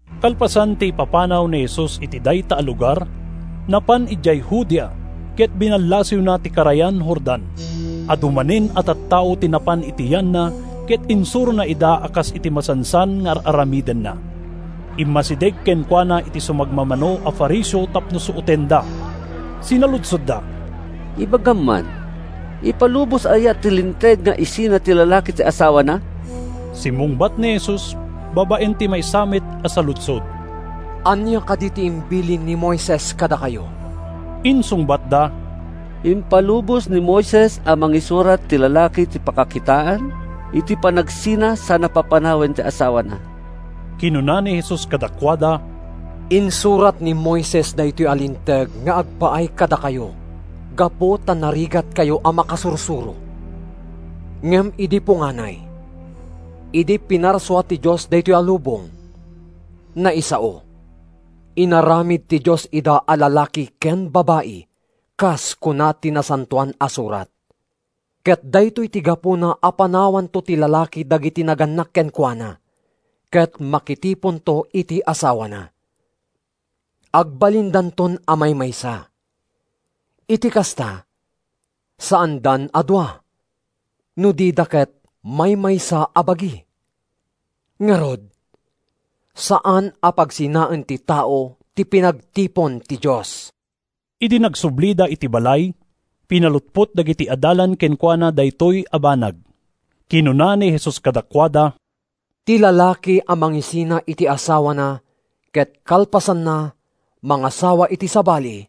Kalpasan ti ipapanaw ni Jesus iti dayta a lugar, napan idiay Judea ken binallasiwna ti karayan Jordan. Adu manen a tattao ti napan iti yanna ket insurona ida a kas iti masansan nga ar-aramidenna. Immasideg kenkuana ti sumagmamano a Fariseo tapno suotenda. Sinaludsodda, “Ibagam man: Ipalubos aya ti Linteg nga isina ti lalaki ti asawana?” Simmungbat ni Jesus babaen ti maysa met a saludsod, “Ania kadi ti imbilin ni Moises kadakayo?” Insungbatda, “Impalubos ni Moises a mangisurat ti lalaki iti pakakitaan iti panagsina sana papanawen ti asawana.” Kinuna ni Jesus kadakuada: “Insurat ni Moises daytoy a linteg nga agpaay kadakayo gapu ta narigatkayo a makasursuro. Ngem idi punganay, idi pinarsua ti Dios daytoy lubong, naisao, ‘Inaramid ti Dios ida a lalaki ken babai,’ kas kuna ti Nasantoan a Surat. ‘Ket daytoy ti gapuna a panawanto ti lalaki dagiti nagannak kenkuana ket makitiponto iti asawana; agbalindanton a maymaysa. Iti kasta, saandan a dua, no dida ket maymaysa a bagi.’ Ngarud, saan a pagsinaen ti tao ti pinagtipon ti Dios.” Idi nagsublida iti balay, pinalutpot dagiti adalan kenkuana daytoy a banag. Kinuna ni Jesus kadakuada, “Ti lalaki a mangisina iti asawana ket kalpasanna mangasawa iti sabali,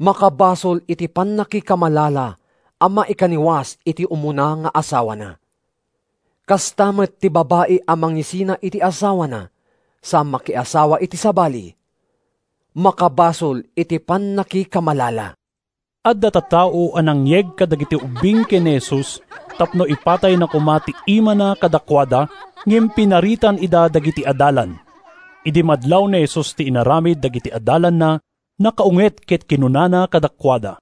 makabasol iti pannakikamalala a maikaniwas iti umuna nga asawana. Kasta met, ti babai a mangisina iti asawana sa makiasawa iti sabali, makabasol iti pannakikamalala.” Adda tattao a nangyeg kadagiti ubbing ken ni Jesus tapno ipatayna koma ti imana kadakuada, ngem pinaritan ida dagiti adalan. Idi madlaw ni Jesus ti inaramid dagiti adalanna, nakaunget ket kinunana kadakuada,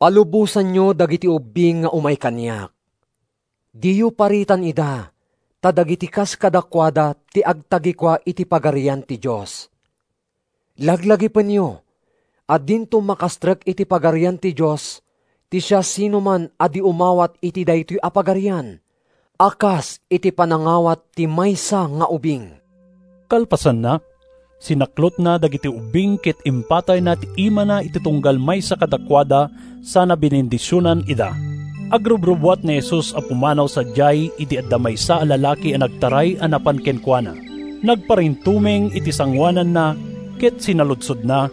“Palubosanyo dagiti ubbing nga umay kaniak. Diyo paritan ida ta dagiti kas kadakuada ti agtagikua iti Pagarian ti Dios. Laglagipenyo a dinto makastrek iti Pagarian ti Dios ti siasinoman a di umawat iti daytoy a Pagarian a kas iti panangawat ti maysa nga ubing.” Kalpasanna, sinaklotna dagiti ubbing ket impatayna ti imana iti tunggal maysa kadakuada sana binendisionan ida. Agrubrubbuat ni Jesus a pumanaw sadiay idi adda maysa a lalaki a nagtaray a napan kenkuana. Nagparintumeng iti sangoananna, ket sinaludsodna,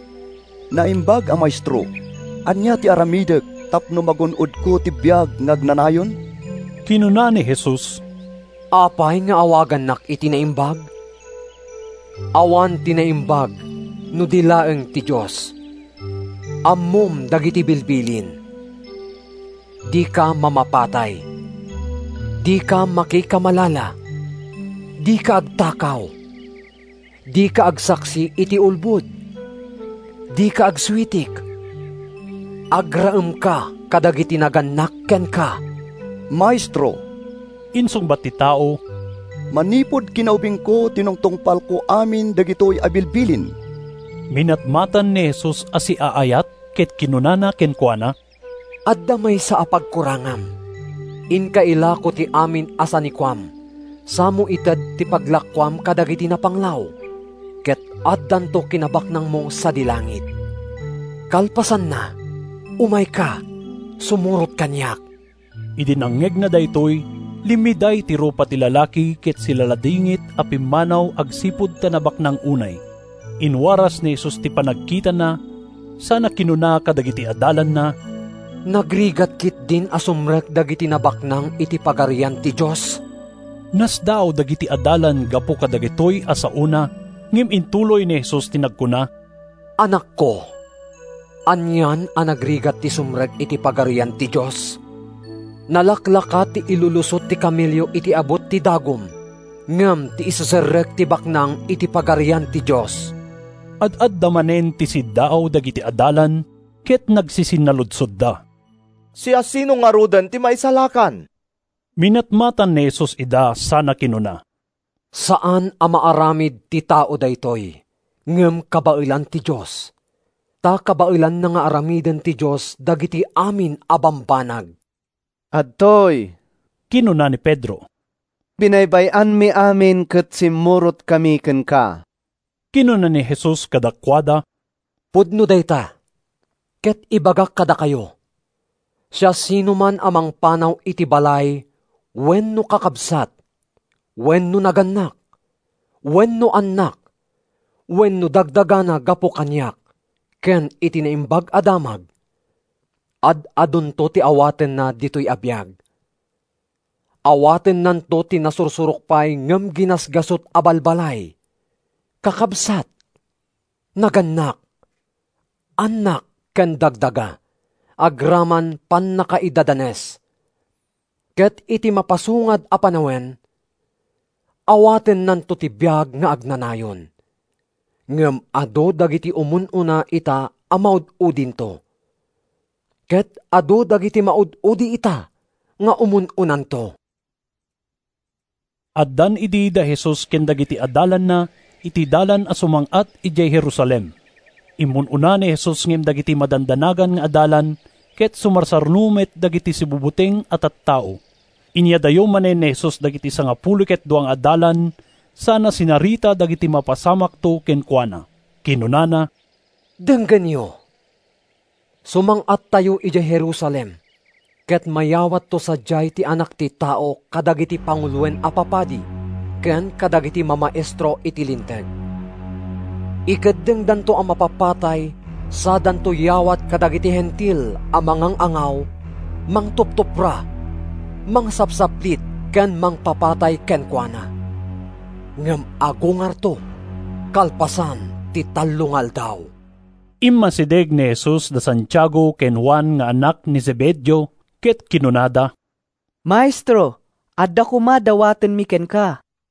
“Naimbag a Maestro, ania ti aramidek tapno magun-odko ti biag nga agnanayon?” Kinuna ni Jesus, “Apay nga awagannak iti naimbag? Awan ti naimbag no di laeng ti Dios. Ammom dagiti bilbilin: ‘Dika mamapatay. Dika makikamalala. Dika agtakaw. Dika agsaksi iti ulbod. Dika agsuitik. Agraemka kadagiti nagannak kenka.’” “Maestro,” insungbat ti tao, “manipud kinaubingko tinungtungpalko amin dagitoy a bilbilin.” Minatmatan ni Jesus a siaayat ket kinunana kenkuana, “Adda maysa a pagkurangam. Inka ilako ti amin a sanikuam samo ited ti paglakoam kadagiti napanglaw, ket addanto kinabaknangmo sadi langit. Kalpasanna, umayka sumurot kaniak.” Idi nangngegna daytoy, limmiday ti rupana ti lalaki ket silaladingit a pimmanaw agsipud ta nabaknang unay. Inwaras ni Jesus ti panagkitana sana kinuna kadagiti adalanna, “Nagrigat ketdin a sumrek dagiti nabaknang iti Pagarian ti Dios!” Nasdaaw dagiti adalan gapu kadagitoy a saona, ngem intuloy ni Jesus ti nagkuna, “Annakko, anian a nagrigat ti sumrek iti Pagarian ti Dios! Nalaklaka ti ilulusot ti kamelio iti abut ti dagum ngem ti iseserrek ti baknang iti Pagarian ti Dios.” Ad-adda manen ti siddaaw dagiti adalan, ket nagsisinnaludsodda, “Siasino ngaruden ti maisalakan?” Minatmatan ni Jesus ida sana kinuna: “Saan a maaramid ti tao daytoy, ngem kabaelan ti Dios. Ta kabaelan nga aramiden ti Dios dagiti amin a bambanag.” “Adtoy,” kinuna ni Pedro, “binaybay-anmi amin ket simmurotkami kenka.” Kinuna ni Jesus kadakuada, “Pudno dayta ket ibagak kadakayo, siasinoman a mangpanaw iti balay wenno kakabsat wenno nagannak wenno annak wenno dagdagana gapu kaniak ken iti Naimbag a Damag, ad-adunto ti awatenna ditoy a biag. Awatennanto ti nasursurok pay ngem ginasgasut a balbalay, kakabsat, nagannak, annak ken dagdaga—agraman pannakaidadanes; ket iti mapasungad a panawen, awatennanto ti biag nga agnanayon. Ngem adu dagiti umun-una ita a maud-udinto, ket adu dagiti maud-udi ita nga umun-unanto.” Addan idi da Jesus ken dagiti adalanna iti dalan a sumang-at idiay Jerusalem. Immun-una ni Jesus ngem dagiti madandanagan nga adalan ket sumarsaruno met dagiti sibubuteng a tattao. Inyadayo manen ni Jesus dagiti sangapulo ket dua nga adalan sana sinarita dagiti mapasamakto kenkuana. Kinunana, “Denggenyo, sumang-attayo idiay Jerusalem ket mayawatto sadiay ti Anak ti Tao kadagiti panguloen a papadi ken kadagiti mamaestro iti Linteg. Ikeddengdanto a mapapatay sadanto yawat kadagiti Hentil a mangang-angaw, mangtuptupra, mangsapsaplit ken mangpapatay kenkuana. Ngem agungarto kalpasan ti tallo nga aldaw.” Immasideg ken ni Jesus da Santiago ken Juan nga annak ni Zebedeo, ket kinunada, “Maestro, adda koma dawatenmi kenka.”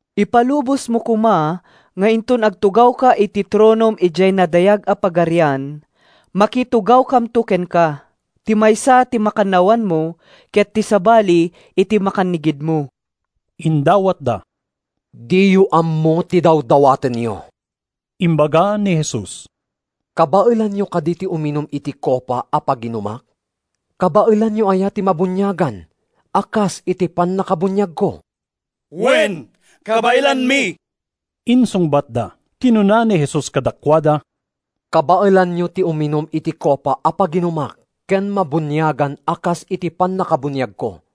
“Ipalubosmo koma nga inton agtugawka iti tronom idiay nadayag a Pagarian, makikatugawkamto kenka, ti maysa iti makannawanmo ket ti sabali iti makannigidmo,” indawatda. “Diyo ammo ti dawdawatenyo,” imbaga ni Jesus. “Kabaelanyo kadi ti uminum iti kopa a paginumak? Kabaelanyo aya ti mabuniagan a kas iti pannakabuniagko?” “Wen, kabaelanmi,” insungbatda. Kinuna ni Jesus kadakuada, “Kabaelanyo ti uminum iti kopa a paginumak ken mabuniagan a kas iti pannakabuniagko.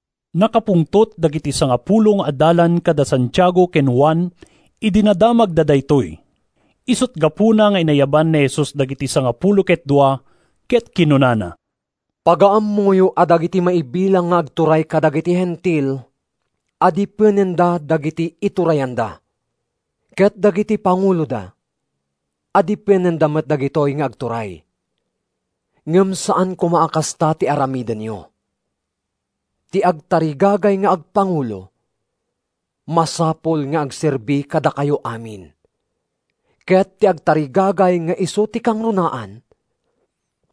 Nakapungtot dagiti sangapulo nga adalan kada Santiago ken Juan idi nadamagda daytoy. Isut’ gapuna nga inayaban ni Jesus dagiti sangapulo ket dua ket kinunana, “Pagaammoyo a dagiti maibilang nga agturay kadagiti Hentil adipenenda dagiti iturayanda, ket dagiti panguloda adipenenda met dagitoy nga agturay. Ngem saan koma a kasta ti aramidenyo. Ti agtarigagay nga agpangulo, masapul nga agserbi kadakayo amin. Ket ti agtarigagay nga isu ti kangrunaan,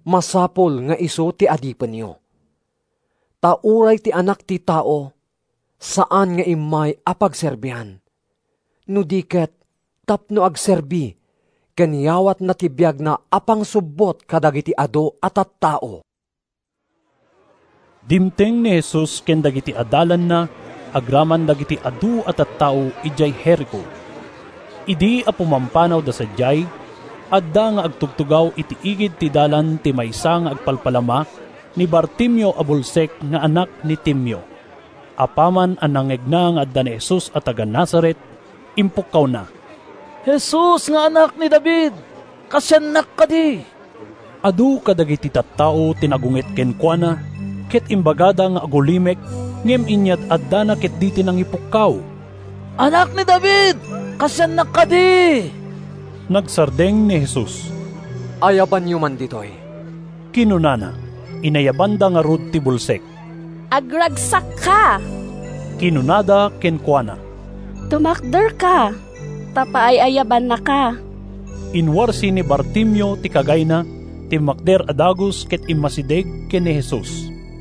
masapul nga isu ti adipenyo. Ta uray ti Anak ti Tao saan nga immay a pagserbian, no di ket tapno agserbi ken yawatna ti biagna a pangsubbot kadagiti adu a tattao.” Dimteng ni Jesus ken dagiti adalanna agraman dagiti adu a tattao idiay Jerico. Idi a pumampanawda sadiay, adda nga agtugtugaw iti igid ti dalan ti maysa nga agpalpalama, ni Bartimeo a bulsek nga anak ni Timeo. Apaman a nangngegna nga adda ni Jesus a taga-Nazaret, impukkawna, “Jesus nga Anak ni David, kaasiannak kadi!” Adu kadagiti tattao ti nagunget kenkuana ket imbagada nga agulimek, ngem inyad-addana ketdi ti nangipukkaw, “Anak ni David, kaasiannak kadi!” Nagsardeng ni Jesus. “Ayabanyo man ditoy,” kinunana. Inayabanda ngarud ti bulsek. “Agragsakka!” kinunada kenkuana. “Tumakderka, ta paayabannaka.” Inwarsi ni Bartimeo ti kagayna, timmakder a dagus ket immasideg ken ni Jesus.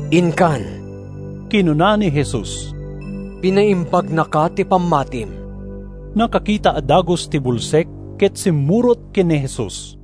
“Inkan,” kinuna ni Jesus. “Pinaimbagnaka ti pammatim.” Nakakita a dagus ti bulsek ket simmurot ken ni Jesus.